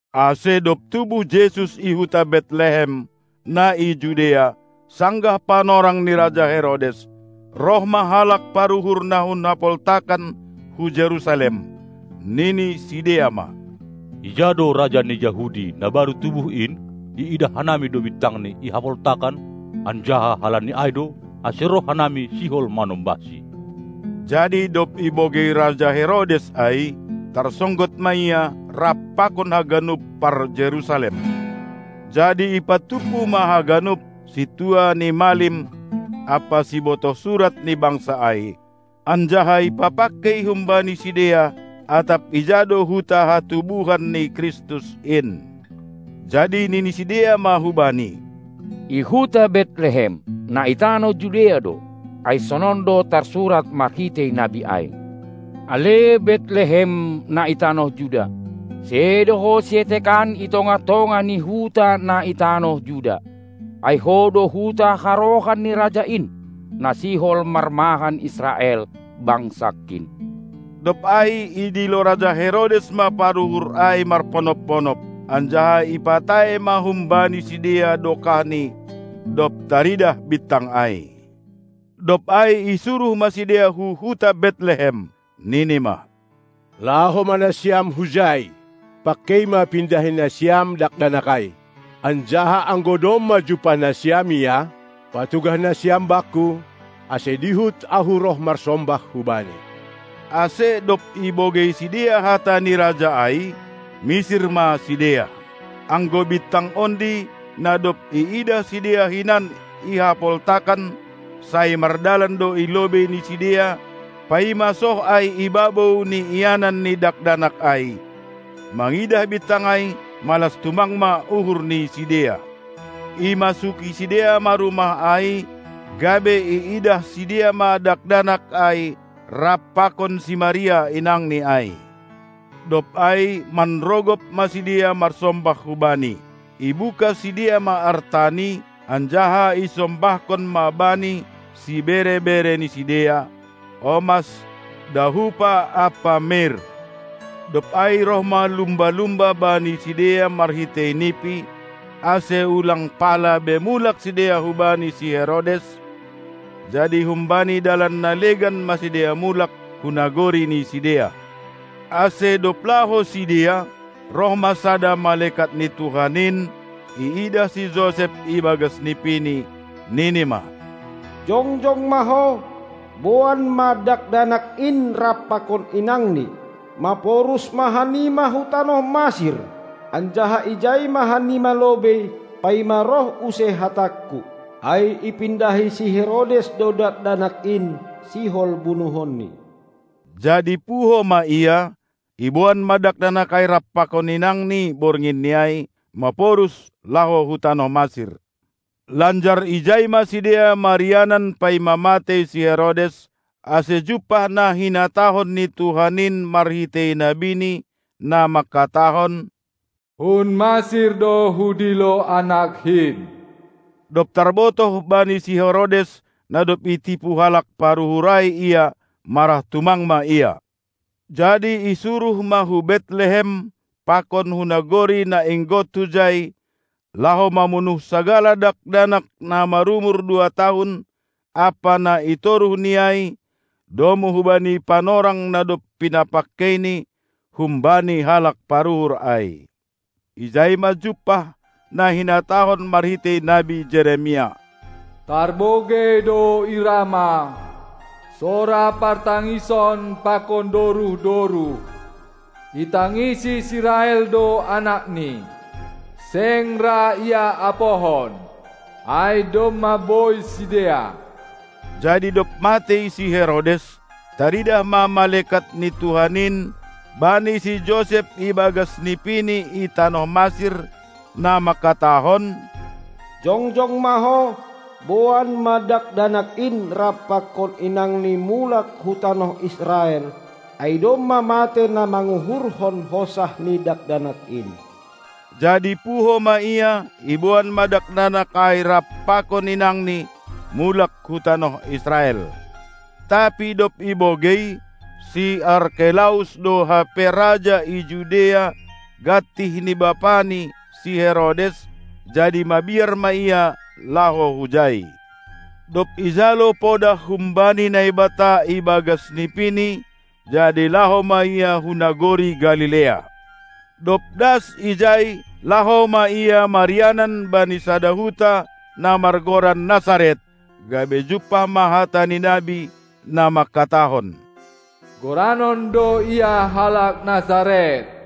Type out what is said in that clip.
Ase dob tubuh Jesus i huta Betlehem, na i Judea, sanggah panorang ni raja Herodes, roh ma halak paruhur na hun hapoltakan hu Jerusalem, nini sidea ma: Ija do Raja ni Jahudi na baru tubuh in? Iidah hanami do bintangNi i hapoltakan, anjaha halani ai do, ase roh hanami sihol manombahSi. Jadi dob ibogei raja Herodes ai, tarsonggot ma ia rap pakon haganup parJerusalem. Jadi ipatumpu ma haganup sintua ni malim ampa sibotoh surat ni bangsa ai, anjaha ipapangkei humbani sidea, atap ija do huta hatubuhan ni Kristus in. Jadi nini sidea ma hubani: I huta Betlehem, na i tanoh Judea do, ai sonon do tarsurat marhitei nabi ai: Ale Betlehem, na i tanoh Juda, sedo ho sietekan i tongah-tongah ni huta na i tanoh Juda, ai ho do huta harohan ni Raja in, na sihol marmahan Israel, bangsangKin! Dob ai idilo raja Herodes ma paruhur ai marponop-ponop, anjaha ipatae ma humbani sidea dokahni, dob taridah bintang ai. Dob ai isuruh ma sidea hu huta Betlehem, nini ma: Laho ma nasiam hujai, pangkei ma pindahi nasiam Dakdanak ai! Anjaha anggo domma jumpah nasiam Ia, patugah nasiam bakku, ase dihut ahu roh marsombah hu Bani. Ase dob ibogei sidea hata ni raja ai, misir ma sidea. Anggo bintang ondi, na dob iidah sidea hinan i hapoltakan, sai mardalan do i lobei ni sidea, paima soh ai i babou ni ianan ni Dakdanak ai, Mangidah bintang ai, malas tumang ma uhur ni sidea. Imasuki sidea ma rumah ai, gabe iidah sidea ma Dakdanak ai rap pakon si Maria inangNi ai. Dob ai manrogop ma sidea marsombah hu-Bani; ibuka sidea ma artani anjaha isombahkon ma Bani sibere-bere ni sidea: omas, dahupa ampa mir. Dob ai roh ma lumba-lumba bani sidea marhitei nipi, ase ulang pala be mulak sidea hubani si Herodes, jadi humbani dalan na legan ma sidea mulak hu nagori ni sidea. Ase dob laho sidea, roh ma sada malekat ni Tuhan in iidah si Josep ibagas nipini, nini ma: Jongjong ma ho, boan ma Dakdanak in rap pakon inangNi, maporus ma hanima hu tanoh Masir, anjaha ijai ma hanima lobei, paima roh use hatangku, ai ipindahi si Herodes do Dakdanak in, sihol bunuhonni. Jadi puho ma ia, iboan ma Dakdanak ai rap pakon inangNi bornginni ai, maporus laho hu tanoh Masir. Lanjar ijai ma sidea marianan paima matei si Herodes, ase jumpah na hinatahon ni Tuhan in marhitei nabini, na mangkatahon: Hun Masir do hudilo AnakKin. Dob tarbotoh bani si Herodes, na dob itipu halak paruhur ai ia, marah tumang ma ia; jadi isuruh ma hu Betlehem pakon hu nagori na inggot hujai, laho mamunuh sagala dakdanak na marumur dua tahun ampa na i toruh ni ai domu hubani panorang na dob pinapangkeini humbani halak paruhur ai. Ijai ma jumpah na hinatahon marhitei nabi Jeremias: Tarbogei do i Rama sora partangison pakon doruh-doruh. Itangisi si Rahel do anakni, seng ra ia apohon, ai domma bois sidea. Jadi dob matei si Herodes, taridah ma malekat ni Tuhan in bani si Josep ibagas nipini i tanoh Masir, na mangkatahon: Jongjong ma ho, boan ma Dakdanak in rap pakon inangNi mulak hu tanoh Israel, ai domma matei na manguhurhon hosah ni Dakdanak in! Jadi puho ma ia, iboan ma Dakdanak ai rap pakon inangNi mulak hu tanoh Israel. Tapi dob ibogei, si Arkelaus do hape raja i Judea gantih ni bapani, si Herodes, jadi mabiar ma ia laho hujai. Dob ijalo podah humbani Naibata ibagas nipini, jadi laho ma ia hu nagori Galilea. Dob das ijai, laho ma ia marianan bani sada huta na margoran Nasaret, gabe jumpah ma hata ni nabi, na mangkatahon: Goranon do Ia halak Nasaret.